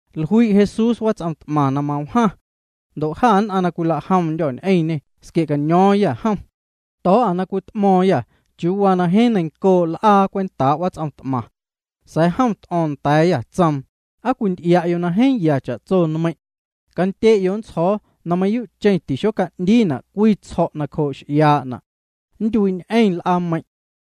Jlui' Jesús wats'om t'maⁿ na mawjaⁿ. Ndo' jâ nn'aⁿ na cwila'jomndyô̱ ñ'eⁿñê squie'caño̱o̱ⁿyâ jom. To̱o̱'â na cwit'mo̱o̱ⁿyâ chiuu waa na jeeⁿ neiⁿncoo' l'aa cwentaa' wats'om t'maⁿ. Sa̱a̱ jom t'o̱o̱ⁿ nda̱a̱yâ, tsoom: —¿Aa cwinty'ia'yo' na jeeⁿ ya cha'tso nmeiⁿ'? Candye'yo' nntsjo̱o̱ na mayuu'cheⁿ tixoca'ndiina' cwii tsjo̱' nacjoo' x'iaa'na'. Nntyuii'ñ'eⁿ l'aameiⁿ'.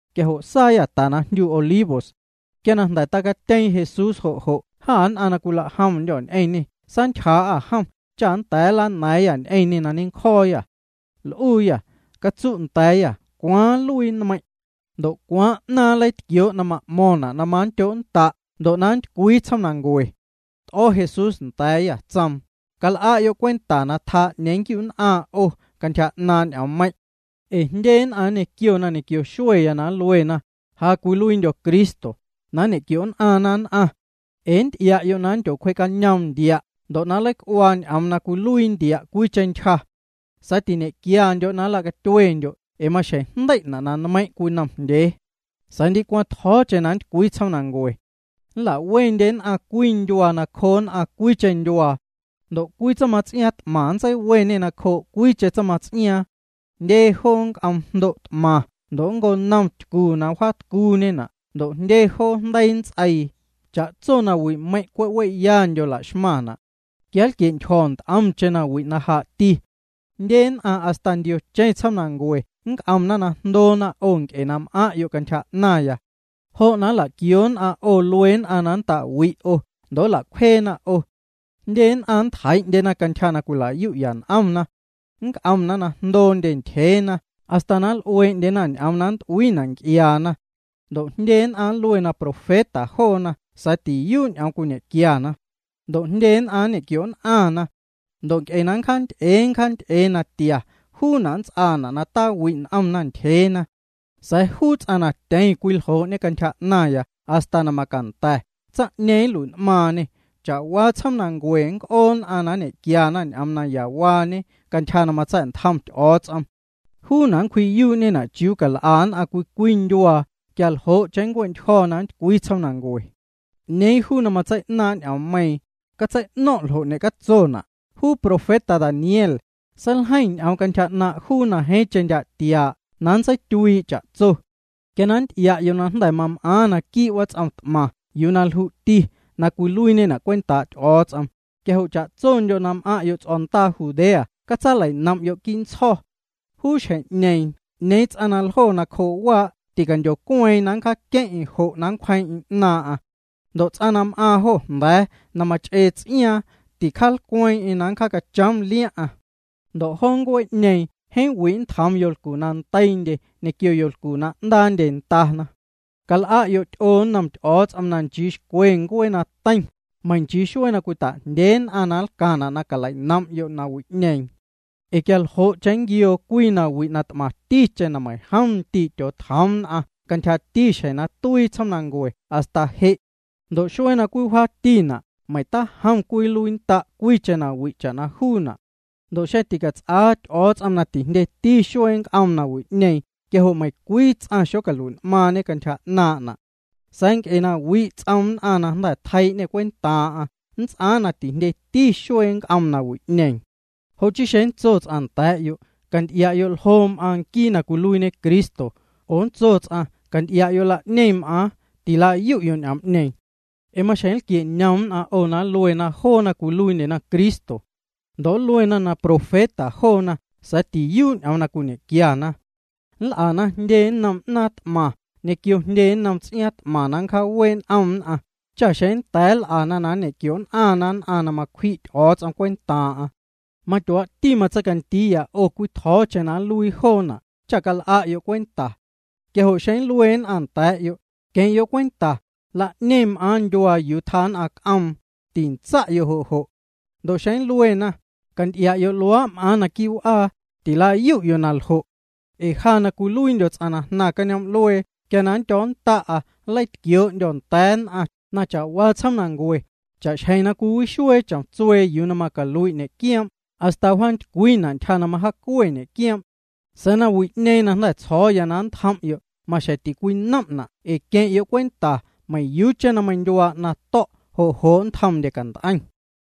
Quia jo' saayâ ta na jndyu Olivos. Ndo' quia jnda̱ tacatyeeⁿ Jesús jo' jo' jâ nn'aⁿ na cwila'jomndyô̱ ñ'eⁿñê saantyjaa'â jom cha nnda̱a̱ nlana̱a̱ⁿyâ ñ'eⁿñê na ñencjo̱o̱yâ. L'uuyâ: —Catsu' nda̱a̱yâ cwaaⁿ nluii na nmeiiⁿ'. Ndo' ¿cwaaⁿ 'naaⁿ na nleitquioo' na m'mo̱ⁿna' na manndyo'nnda' ndo' na nntycwii tsjoomnancue? T'o̱ Jesús nda̱a̱yâ, tsoom: —Cal'a'yo' cwenta na tjaa 'ñeeⁿ nnquiu'nn'aⁿ 'o cantyja 'naaⁿ ñ'oommeiⁿ'. Ee jndye nn'aⁿ nñequiona ñequio xueya na nluena: “Ja cwiluiindyo̱ nquii Cristo”, na nñe'quio'nn'aⁿna nn'aⁿ. Ee nnty'ia'yo' na nndyocwjee'cañoom ntia' ndo' nleic'uaa ñ'oom na cwiluii ntia' cwiicheⁿ ntyja. Sa̱a̱ tiñe'quiandyo' na nlacatyuendyo' ee maxjeⁿ jndei'na' na nmeiⁿ' cwinomjndyee. Sa̱a̱ ndicwaⁿ tjo̱o̱cheⁿ na nntycwii tsjoomnancue. Nla'wendye nn'aⁿ cwii ndyuaa nacjoo nn'aⁿ cwiicheⁿ ndyuaa. Ndo' cwii tsaⁿmats'iaaⁿ t'maⁿ nntseiweñê nacjoo' cwiicheⁿ tsaⁿmats'iaaⁿ. Jndye joo nnc'oom jndo' t'maⁿ ndo' nnconom ntycu na wjaatcuuñena' ndo' jndye jo jndeii nnts'eii. Cha'tso nawi'meiⁿ' cwe' we'yandyo la'xmaⁿna'. Quia nlquie'ntyjo̱ nt'omcheⁿ nawi' na jaa'ti. ’Jndye nn'aⁿ hasta ndiocheⁿ tsjoomnancue nnc'omna na jndoona 'o nc'e na m'aⁿ'yo' cantyja 'naⁿya. Jo' na nla'quioo nn'aⁿ 'o luee nn'aⁿ na nnta'wi'na 'o, ndo' nla'cwjeena 'o. Jndye nn'aⁿ nntjeii'ndyena cantyja na cwila'yu'ya n'omna. Nnc'omna na jndoondye ntyjeena hasta na nl'uee'ndyena ñ'oom na nnt'uiina' nc'iaana. Ndo' jndye nn'aⁿ nluena na profeta joona sa̱a̱ tiyuu' ñ'oom cwiñequiana. Ndo' jndye nn'aⁿ nñe'quio'nn'aⁿna. Ndo' nc'e na nncjaanty'ee nncjaanty'ee natia, juuna' nnts'aana' na tawi' n'omndye ntyjeena. Sa̱a̱ juu ts'aⁿ na tyeⁿ cwiljoo'ñe cantyja 'naⁿya hasta na macanda̱, tsaⁿ'ñeeⁿ nlui'n'maaⁿñê. Cha'waa tsjoomnancue nnc'oo nn'aⁿ na nñe'quiana ñ'oom nayawaañe cantyja na matsa̱'ntjom Ty'o̱o̱ts'om. Juuna' nncwji'yuu'ñena' chiuu cal'a nn'aⁿ cwii cwii ndyuaa, quia ljo'cheⁿ nncue'ntyjo̱ na nntycwii tsjoomnancue. ’'Ñeeⁿ juu ts'aⁿ na matsei'naaⁿ' ñ'oommeiiⁿ, catsei'no̱ⁿ' ljo' ñecatsona'. Juu profeta Daniel, seiljeiⁿ ñ'oom cantyja 'naaⁿ' juu na jeeⁿcheⁿ ndyaa' tiaa' na nntseityuii' cha'tso. Quia na nnty'ia'yo' na jnda̱ mam'aaⁿ naquii' wats'om t'maⁿ yuu na lju'ti na cwiluiiñena' cwentaa' Ty'o̱o̱ts'om, quia jo' cha'tsondyo' na m'aⁿ'yo' ts'o̱ndaa Judea catsalei'nom'yo' quii' ntsjo̱. Juu xjeⁿ'ñeeⁿ 'ñeeⁿ ts'aⁿ na ljo nacjoo' waa' ticandyocueeⁿ na nncjaaqueⁿ'eⁿ jo' na nncwjeeⁿ'eⁿ 'naaⁿ'aⁿ. Ndo' ts'aⁿ na m'aaⁿ jo jnda̱a̱, na mach'ee ts'iaaⁿ, ticjaalcweeⁿ'eⁿ na nncjaacachoom liaⁿ'aⁿ. Ndo' joo ncuee'ñeeⁿ jeeⁿ wi' nntjoom yolcu na ndeiindye ñequio yolcu na 'ndaandye ndana. Cal'a'yo' ty'oo nnom Ty'o̱o̱ts'om na nchii xcwe ncuee na teiⁿ, meiⁿ nchii xuee na cwita'jndyee nn'aⁿ na nlcaⁿna' na calei'nom'yo' nawi'ñeeⁿ. Ee quia ljo'cheⁿ nnquioo cwii nawi' na t'maⁿticheⁿ na meiⁿjom ndii' tyootjoom nn'aⁿ cantyjati xjeⁿ na tuii tsjoomnancue hasta je'. Ndo' xuee na cwii wjaatina', meiⁿ tajom cwii nluiinnda' cwiicheⁿ nawi' cha'na juuna'. Ndo' xeⁿ ticats'aa Ty'o̱o̱ts'om na tijndyeti xuee na nnc'oom nawi'ñeeⁿ quia jo' meiⁿcwii ts'aⁿ xocalui'n'maaⁿñe cantyja 'naaⁿ'na'. Sa̱a̱ nc'e na wi' ts'oom nn'aⁿ na jnda̱ tjeii'ñê cwentaaⁿ'aⁿ, nnts'aaⁿ na tijndyeti xuee na nnc'oom nawi'ñeeⁿ. ’Jo' chii xeⁿ nntso cwii ts'aⁿ nda̱a̱'yo': “Canty'ia'yo' ljo m'aaⁿ nquii na cwiluiiñe Cristo”, oo nntso ts'aⁿ: “Canty'ia'yo', la'ñeⁿ m'aaⁿ”, tilayu'yo' ñ'oom'ñeeⁿ. Ee maxjeⁿ nlquie'cañom nn'aⁿ 'o na nluena joona cwiluiindyena Cristo. Ndo' nluena na profeta joona sa̱a̱ tiyuu' ñ'oom na cwiñe'quiana. Nl'ana jndye nnom 'naaⁿ t'maⁿ ñequio jndye nnom ts'iaaⁿ t'maⁿ na nncjaawee' n'om nn'aⁿ cha xeⁿ na nnda̱a̱ nl'ana na nñequio'nn'aⁿna nn'aⁿ na macwji' Ty'o̱o̱ts'om cwentaaⁿ'aⁿ. Matyuaa'ti matseicandiiya 'o cwii tjo̱o̱cheⁿ na nluii joona' cha cal'a'yo' cwenta. Quia jo' xeⁿ nlue nn'aⁿ nda̱a̱'yo': “Queⁿ'yo' cwenta, la'ñeⁿ m'aaⁿ ndyuaa yuu tjaa nn'aⁿ c'oom”, tintsa'yo' jo' jo'. Ndo' xeⁿ na nluena: “Canty'ia'yo', luaa' m'aaⁿ naquii' w'aa”, tilayu'yo' na ljo'. Ee ja na cwiluiindyo̱ tsaⁿ na jnaⁿ cañoom'luee quia na nndyo̱o̱nnda'a nleitquioo'ndyo̱ nda̱a̱ nn'aⁿ na cha'waa tsjoomnancue, cha'xjeⁿ na cwiwixuee chomtsuee yuu na macalui' ñe'quioom' hasta wjaantycwiina' ntyja na majaacue ñe'quioom'. Sa̱a̱ nawi'ñeeⁿ na jnda̱ tsjo̱o̱ na nntjom'yo', maxjeⁿ ticwinom'na' ee queⁿ'yo' cwenta, meiⁿyuucheⁿ na meindyuaa 'naⁿ to̱', jo' jo' nntjomndye cant'eiⁿ.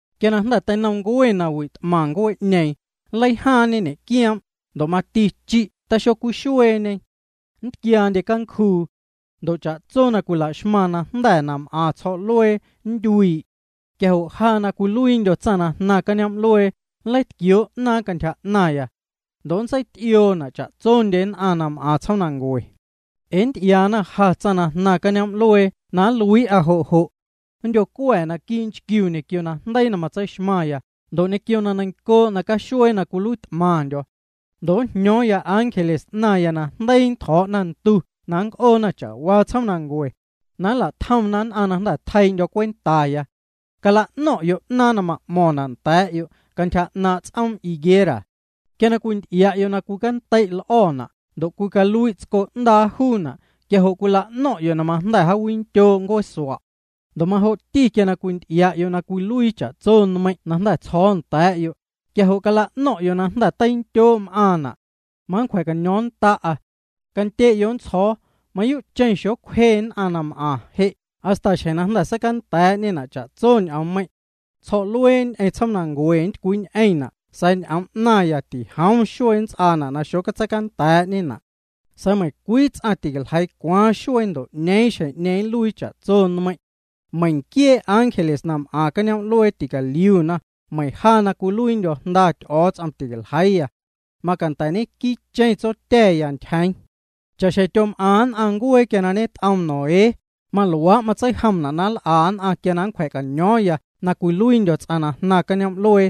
’Quia na jnda̱ teinomncue nawi' t'maⁿ ncuee'ñeeⁿ, nleijaaⁿñe ñe'quioom', ndo' mati chi' taxocwixueeñe. Nntquiaandye cancjuu. Ndo' cha'tso na cwila'xmaⁿ najnda̱ na m'aⁿ tsjo̱'luee nntyuii'. Quia jo' ja na cwiluiindyo̱ tsaⁿ na jnaⁿ cañoom'luee, nleitquioo' 'naaⁿ cantyja 'naⁿya. Ndo' nntseity'ioona' cha'tsondye nn'aⁿ na m'aⁿ tsjoomnancue. Ee nnty'iaana ja, tsaⁿ na jnaⁿ cañoom'luee na nluii'a jo' jo'. Nndyo̱cua̱ naquii' nchquiu ñequio najndeii na matseixmaⁿya ndo' ñequio na neiⁿncoo' nacaxuee na cwiluiit'maⁿndyo̱. Ndo' njño̱o̱ⁿya ángeles 'naⁿya na jndeii ntjo̱'na ndu na nnc'oona cha'waa tsjoomnancue, na nla'tjomna nn'aⁿ na jnda̱ tjeii'ndyo̱ cwentaya. ’Cala'no̱ⁿ'yo' 'naaⁿ na ma'mo̱ⁿna' nda̱a̱'yo' cantyja 'naaⁿ' ts'oom higuera. Quia na cwinty'ia'yo' na cwinntei' l'o̱na' ndo' cwicalui' tsco 'ndaa juuna', quia jo' cwila'no̱ⁿ'yo' na majnda̱ jaawindyoo' ncueesua'. Ndo' majo'ti quia na cwinty'ia'yo' na cwiluii cha'tso nmeiⁿ' na jnda̱ tsjo̱o̱ nda̱a̱'yo', quia jo' cala'no̱ⁿ'yo' na jnda̱ teindyoo' m'aaⁿna'. Manncwja̱caño̱o̱ⁿnnda'a. Candye'yo' nntsjo̱o̱, mayuu'cheⁿ na xocwjeñ'eⁿ nn'aⁿ na m'aⁿ je' hasta xjeⁿ na jnda̱ seicanda̱a̱'ñena' cha'tso ñ'oommeiⁿ'. Tsjo̱'luee ñ'eⁿ tsjoomnancue nntycwiiñ'eⁿna' sa̱a̱ ñ'oom 'naⁿya tijoom xuee nnts'aana' na xotseicanda̱a̱'ñena'. ’Sa̱a̱ meiⁿcwii ts'aⁿ ticaljeii cwaaⁿ xuee ndo' 'ñeeⁿ xjeⁿ na nluii cha'tso nmeiⁿ'. Meiⁿ nquiee ángeles na m'aⁿ cañoom'luee ticaliuna, meiⁿ ja na cwiluiindyo̱ Jnda Ty'o̱o̱ts'om ticaljeiiya. Macanda̱ ñenquiicheⁿ Tsotya̱ya ntyjeeⁿ. ’Cha'xjeⁿ na tyom'aⁿ nn'aⁿ ncuee quia ñet'oom Noé, maluaa' matseijomna' na nl'a nn'aⁿ quia na nncwja̱caño̱o̱ⁿya na cwiluiindyo̱ ts'aⁿ na jnaⁿ cañoom'luee.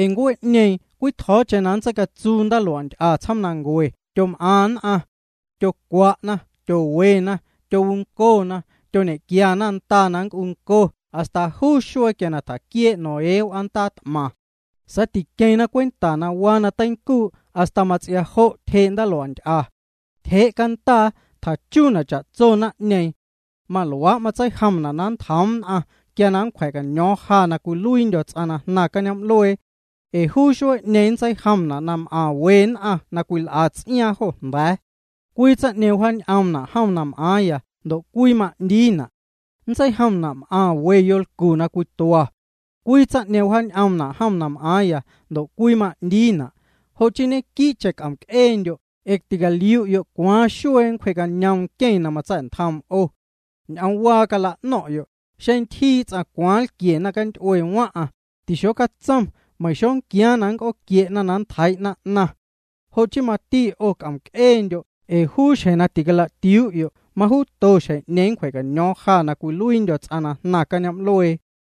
Ee ncuee'ñeeⁿ cwii tjo̱o̱cheⁿ na seicatsuu ndaalua'nty'a tsjoomnancue tyom'aⁿ nn'aⁿ. Tyocwa'na, tyowena, tyowuncona, tyoñe'quiana ndana na nnc'unco hasta juu xuee quia na tjaquiee' Noé w'aandaa t'maⁿ. Sa̱a̱ tiqueⁿna cwenta na waa na teincuu' hasta mats'ia jo' tyjee' ndaalua'nty'a. Tyjee' candaa, tjachuuna' cha'tsondye naⁿ'ñeeⁿ. Maluaa' matseijomna' na nntjoom nn'aⁿ quia na nncwja̱caño̱o̱ⁿ ja na cwiluiindyo̱ ts'aⁿ na jnaⁿ cañoom'luee. Ee juu xuee'ñeeⁿ nntseijomna' m'aⁿ we nn'aⁿ na cwil'a ts'iaaⁿ jo jnda̱a̱. Cwii tsaⁿ'ñeeⁿ wjaañ'oomna' jom na m'aaⁿya ndo' cwii ma'ndiina'. Nntseijomna' m'aⁿ we yolcu na cwitua. Cwii tsaⁿ'ñeeⁿ wjaañ'oomna' jom na m'aaⁿya ndo' cwii ma'ndiina'. ’Jo' chii ñequii'cheⁿ c'om'c'eendyo' ee na ticaliu'yo' cwaaⁿ xuee nncwjee'cañoom nqueⁿ na matsa̱'ntjoom 'o. Ñ'oomwaa cala'no̱ⁿ'yo': Xeⁿ ntyjii ts'aⁿ cwaaⁿ nlquie naⁿcanty'ue waⁿ'aⁿ, tixocatsom meiⁿ xonquiaaⁿ na nnc'ooquie'na na nntjeii'na 'naⁿ. Jo' chii mati 'o c'om'c'eendyo' ee juu xjeⁿ na ticala'tiuu'yo', majuuto xjeⁿ'ñeeⁿ nncwja̱caño̱o̱ⁿ ja na cwiluiindyo̱ ts'aⁿ na jnaⁿ cañoom'luee.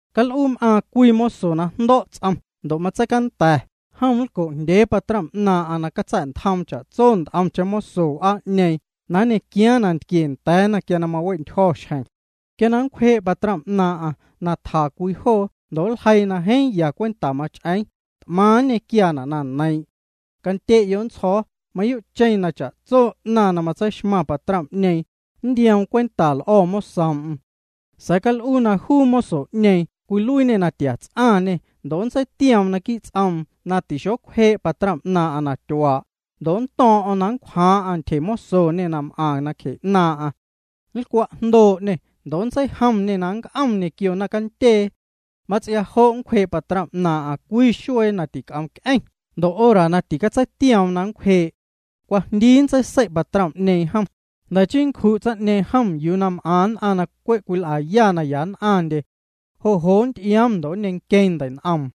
’Cal'uu m'aaⁿ cwii moso na jndo̱' ts'om ndo' matseicanda̱, jom nlco'jndyee patrom 'naaⁿ'aⁿ na catsa̱'ntjoom cha'tso nt'omcheⁿ moso w'aa'ñeeⁿ na nñequiaaⁿ nantquie nda̱a̱na quia na mawe'ntyjo̱ xjeⁿ. Quia na nncwjee' patrom 'naaⁿ'aⁿ na tja cwii joo ndo' nljeii na jeeⁿ ya cwenta mach'eeⁿ, t'maⁿ nñequiaana' na neiiⁿ'. Candye'yo' nntsjo̱o̱, mayuu'cheⁿ na cha'tso 'naⁿ na matseixmaⁿ patrom'ñeeⁿ, nntioom cwenta l'o̱ mosoom'm. Sa̱a̱ cal'uu na juu moso'ñeeⁿ cwiluiiñê na tia ts'aⁿñê ndo' nntseitioom naquii' ts'oom na taxocwjee' patrom 'naaⁿ'aⁿ na tyuaa', ndo' nnto̱o̱ⁿ'o̱ⁿ na nncwjaaⁿ'aⁿ ntyjemosoñe na m'aⁿ nacje 'naaⁿ'aⁿ. Nlcwa'jndoo'ñê ndo' nntseijomñê nnc'om ñequio naⁿcandyee. Mats'ia jo' nncwjee' patrom 'naaⁿ'aⁿ cwii xuee na tic'omc'eⁿ ndo' hora na ticatseitioom na nncwjee'. Cwajndii nntseisei' patrom jom, jnda̱ nncju' tsaⁿ'ñeeⁿ jom yuu na m'aⁿ nn'aⁿ na cwe' cwil'aya na ya nn'aⁿndye. Jo' jo' nnty'ioom ndo' nneiⁿnqueeⁿ ndei'n'oom.